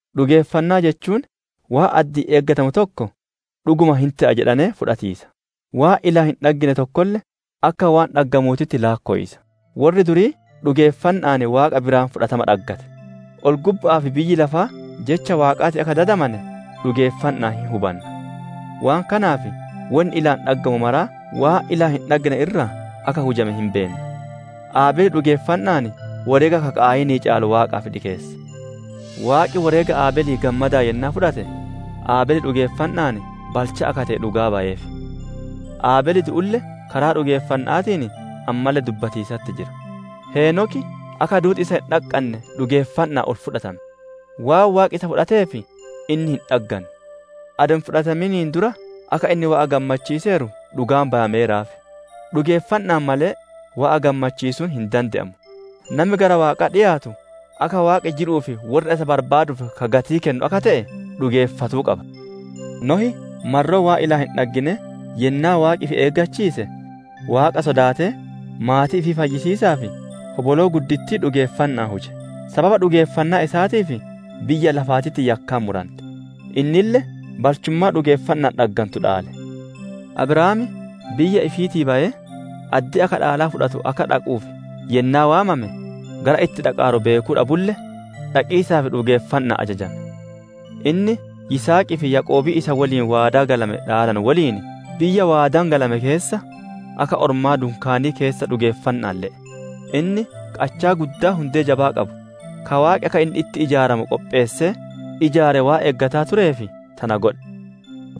Dhugeeffannaa jechuun waan addi'iin eeggatamu tokko, «Dhuguma hin te'a» jedhanee fudhatiisa; waan ilaan hin dhaggine tokkolle akka waan dhaggamuutitti laakkowiisa. Worri durii dhugeeffanna'aan Waaqa biraa fudhatama dhaggate. Ol-gubba'aa fi biyyi lafaa jecha Waaqaatiin akka dadamane dhugeeffanna'aan hin hubanna; waan kanaaf wonni ilaan dhaggamu maraa waan ilaan hin dhaggine irraa akka hujame hin beenna. Abeel dhugeeffanna'aan woreega ka Qaayinii caalu Waaqaaf dhikeesse; Waaqi woreega Abeelii gammadaan yennaa fudhate, Abeel dhugeeffanna'aan balchaa akka te'e dhugaa bayeef; Abeel du'ulle karaa dhugeeffanna'aatiin ammalle dubbatiisatti jira. Heenoki akka duuti isa hin dhaqqanne dhugeeffanna'aan ol fudhatame; waan Waaqi isa fudhateef inni hin dhagganne; adoo hin fudhatamin dura akka inni Waaqa gammachiiseeru dhugaan bayameeraaf. Dhugeeffanna'aan malee Waaqa gammachiisuun hin dande'amu; nami gara Waaqaa dhiyaatu, akka Waaqi jiruu fi worra isa barbaaduuf ka gatii kennu akka te'e dhugeeffatuu qaba. Nohi marroo waan ilaan hin dhagginee yennaa Waaqi ifi eeggachiise, Waaqa sodaatee maatii ifii fayyisiisaaf hoboloo guddittii dhugeeffanna'aan huje. Sababa dhugeeffannaa isaatiif biyya lafaatitti yakkaan murante; innille balchummaa dhugeeffanna'aan dhaggantu dhaale. Abrahaam biyya ifiitii bayee, addee akka dhaalaa fudhatu akka dhaquuf yennaa waamame gara itti dhaqaaru beekuu dhabulle, dhaqiisaaf dhugeeffanna'aan ajajame. Inni Yisihaqii fi Yaaqoobii isa woliin waadaa galame dhaalanu woliin, biyya waadaan galame keessa, akka ormaa dunkaanii keessa dhugeeffanna'aan le'e. Inni qachaa guddaa hundee jabaa qabu, ka Waaqi akka inni itti ijaaramu qopheessee ijaare waan eeggataa tureef tana godhe.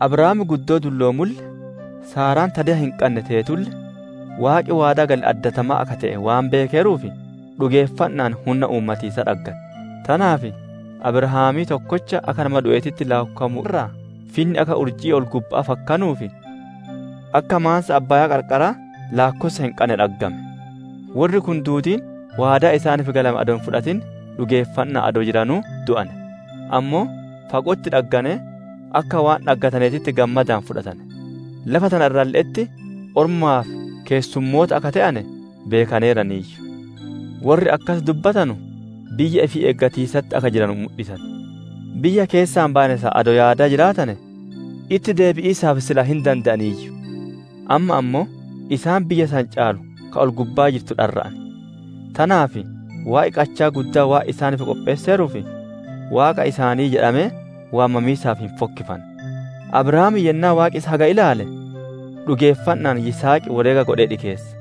Abrahaam guddoo dulloomulle, Saaraan ta deya hin qanne teetulle, Waaqi waadaa gale addatamaa akka te'e waan beekeeruuf, dhugeeffanna'aan hunna uumatiisaa dhaggate. Tanaaf Abrahaamii tokkocha akka nama du'eetitti laakkowamu irraa, finni akka urjii ol-gubba'aa fakkanuu fi akka maansa abbaayaa qarqaraa laakkossa hin qanne dhaggame. Worri kun duudiin waadaa isaaniif galame adoo hin fudhatin dhugeeffanna'aan adoo jiranuu du'ane; ammoo fago'otti dhagganee, akka waan dhaggataneetitti gammadaan fudhatane. Lafa tana irralle'etti ormaa fi keessummoota akka te'ane beekaneeraniiyyu. Worri akkas dubbatanu biyya ifii eegatiisatti akka jiranu mudhisan. Biyya keessaa bayane san adoo yaadaa jiraatane itti deebi'iisaaf sila hin dande'aniiyyu. Amma ammoo, isaan biyya san caalu ka ol-gubbaa jirtu dharra'an; tanaaf Waaqi qachaa guddaa waan isaaniif qopheesseeruuf, «Waaqa isaanii» jedhamee waamamiisaaf hin fokkifanne. Abrahaam yennaa Waaqi isa haga ilaale, dhugeeffanna'aan Yishaaqi woreega godhee dhikeesse.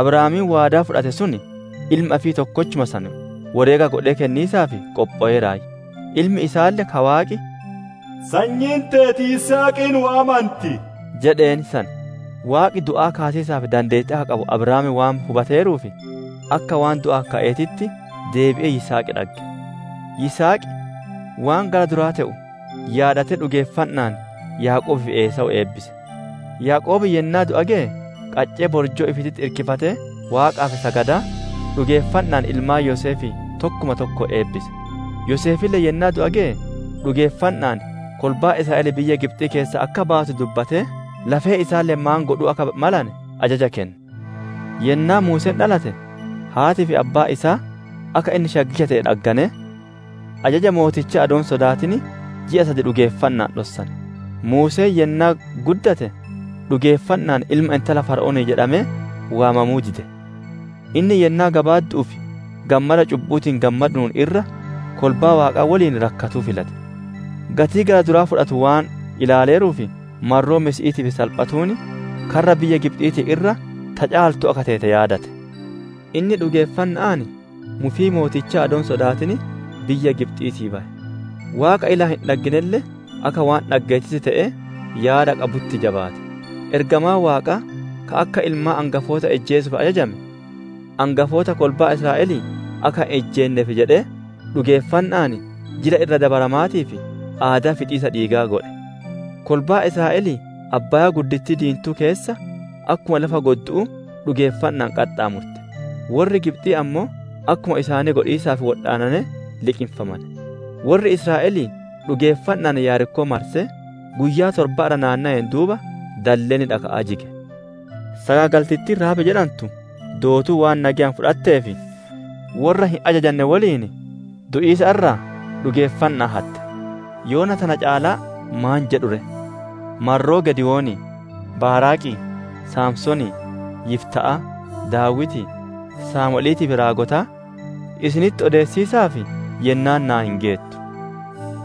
Abrahaamiin waadaa fudhate sun ilma ifii tokkochuma san woreega godhee kenniisaaf qophoweeraayyu. Ilmi isaalle ka Waaqi, «Sanyiin teeti Yisihaqiin waammanti» jedheen san. Waaqi du'aa kaasiisaaf dandeettii akka qabu Abrahaam waan hubateeruuf, akka waan du'aa ka'eetitti deebi'ee Yisihaq dhagge. Yisihaq waan gara duraa te'u yaadatee dhugeeffanna'aan Yaaqoobii fi Esaawu eebbise. Yaaqoob yennaa du'a geye, qaccee borjoo ifiititti irkifatee Waaqaaf sagadaa, dhugeeffanna'aan ilmaan Yoseefii tokkuma tokkoon eebbise. Yoseefille yennaa du'a geye, dhugeeffanna'aan kolbaan Israa'elii biyya Gibxii keessaa akka baatu dubbatee, lafee isaalle maan godhuu akka malane ajaja kenne. Yennaa Muuseen dhalate, haatii fi abbaan isaa akka inni shaggicha te'e dhagganee, ajaja mootichaa adoo hin sodaatin ji'a sad dhugeeffanna'aan dhossane. Muuseen yennaa guddate, dhugeeffanna'aan ilma intala Fara'oonii jedhamee waamamuu dide. Inni yennaa gabaaddu'uuf gammada cubbu'uutiin gammadu'uun irra, kolbaa Waaqaa woliin rakkatuu filate. Gatii gara duraa fudhatu waan ilaaleeruuf, marroo Masiihiitiif salphatuun, karra biyya Gibxiitiin irra, ta caaltu akka teete yaadate. Inni dhugeeffanna'aan, mufii mootichaa adoo hin sodaatin biyya Gibxiitii baye; Waaqa ilaan hin dhagginelle akka waan dhaggeetitti te'ee yaada qabutti jabaate. Ergamaan Waaqaa ka akka ilmaan angafoota ijjeesuuf ajajame, angafoota kolbaa Israa'elii akka hin ijjeenneef jedhee, dhugeeffanna'aan Jila Irra Dabaramaatii fi aadaa fixiisa dhiigaa godhe. Kolbaan Israa'elii Abbaayaa Diintuu keessa, akkuma lafa goddu'uu dhugeeffanna'aan qaxxaamurte; worri Gibxii ammoo akkuma isaanii godhiisaaf wodhaanee liqinfame. Worri Israa'elii dhugeeffanna'aan Yerikoo marsee, guyyaa torba irra naannoween duuba dalleenni dhaka'aa jige. Sagaagaltittiin Rahaab jedhantu dootuu waan nageyaan fudhatteef, worra hin ajajane woliin du'iisa irraa dhugeeffanna'aan hatte. Yoona tana caalaa maan jedhu ree? Marroo Giidewonii, Baaraaqii, Samsoonii, Yifta'aa, Daawitii, Saamu'eliitii fi raagotaa isinitti odeessiisaaf yennaan naa hin geettu.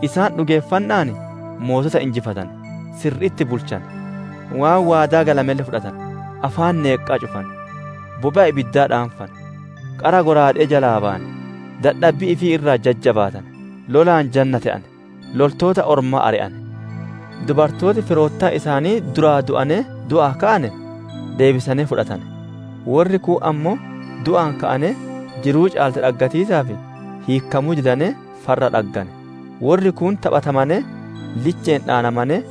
Isaan dhugeeffanna'aan mootota injifatane; sirri'itti bulchane; waan waadaa galamelle fudhatane; afaan neenqaa cufane; bobe'a ibiddaa dhaanfane; qara shallaaga'aa jalaa bayane; dadhabbii ifii irraa jajjabaatane; lolaan janna te'ane; loltoota ormaa ari'ane. Dubartooti firoottan isaanii duraa du'anee, du'aa ka'ane, deebisanee fudhatane. Worri kuun ammoo du'aa ka'anee jiruu caalte dhaggatiisaaf, hiikkamuu didanee, farra dhaggane. Worri kuun taphatamanee liche'een dhaanamanee,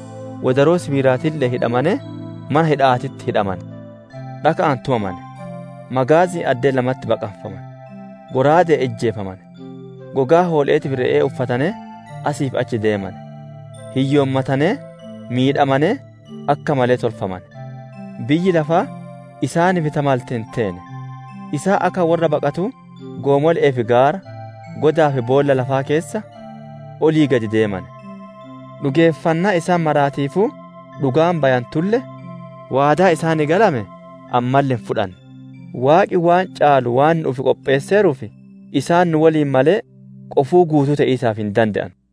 wodaroo sibiilaatiille'een hidhamanee, mana hidha'aatitti hidhamane. Dhaka'aan tumamane; magaazi'iin addee lamatti baqaffamane; shallaaga'aan ijjeefamane; gogaa hoole'eetii fi re'e'ee uffatanee asii fi achi deemane; hiyyoommatanee, miidhamanee, akka malee tolfamane. Biyyi lafaa isaaniif ta malte hin teene! Isaan akka worra baqatuu goomole'ee fi gaara, godaa fi boolla lafaa keessa olii gadi deemane. Dhugeeffannaa isaan maraatiifuu dhugaan bayantulle, waadaa isaaniif galame ammalle hin fudhanne. Waaqi waan caalu waan nu'uuf qopheesseeruuf, isaan nu woliin malee, qofuu guutuu te'iisaaf hin dande'anu.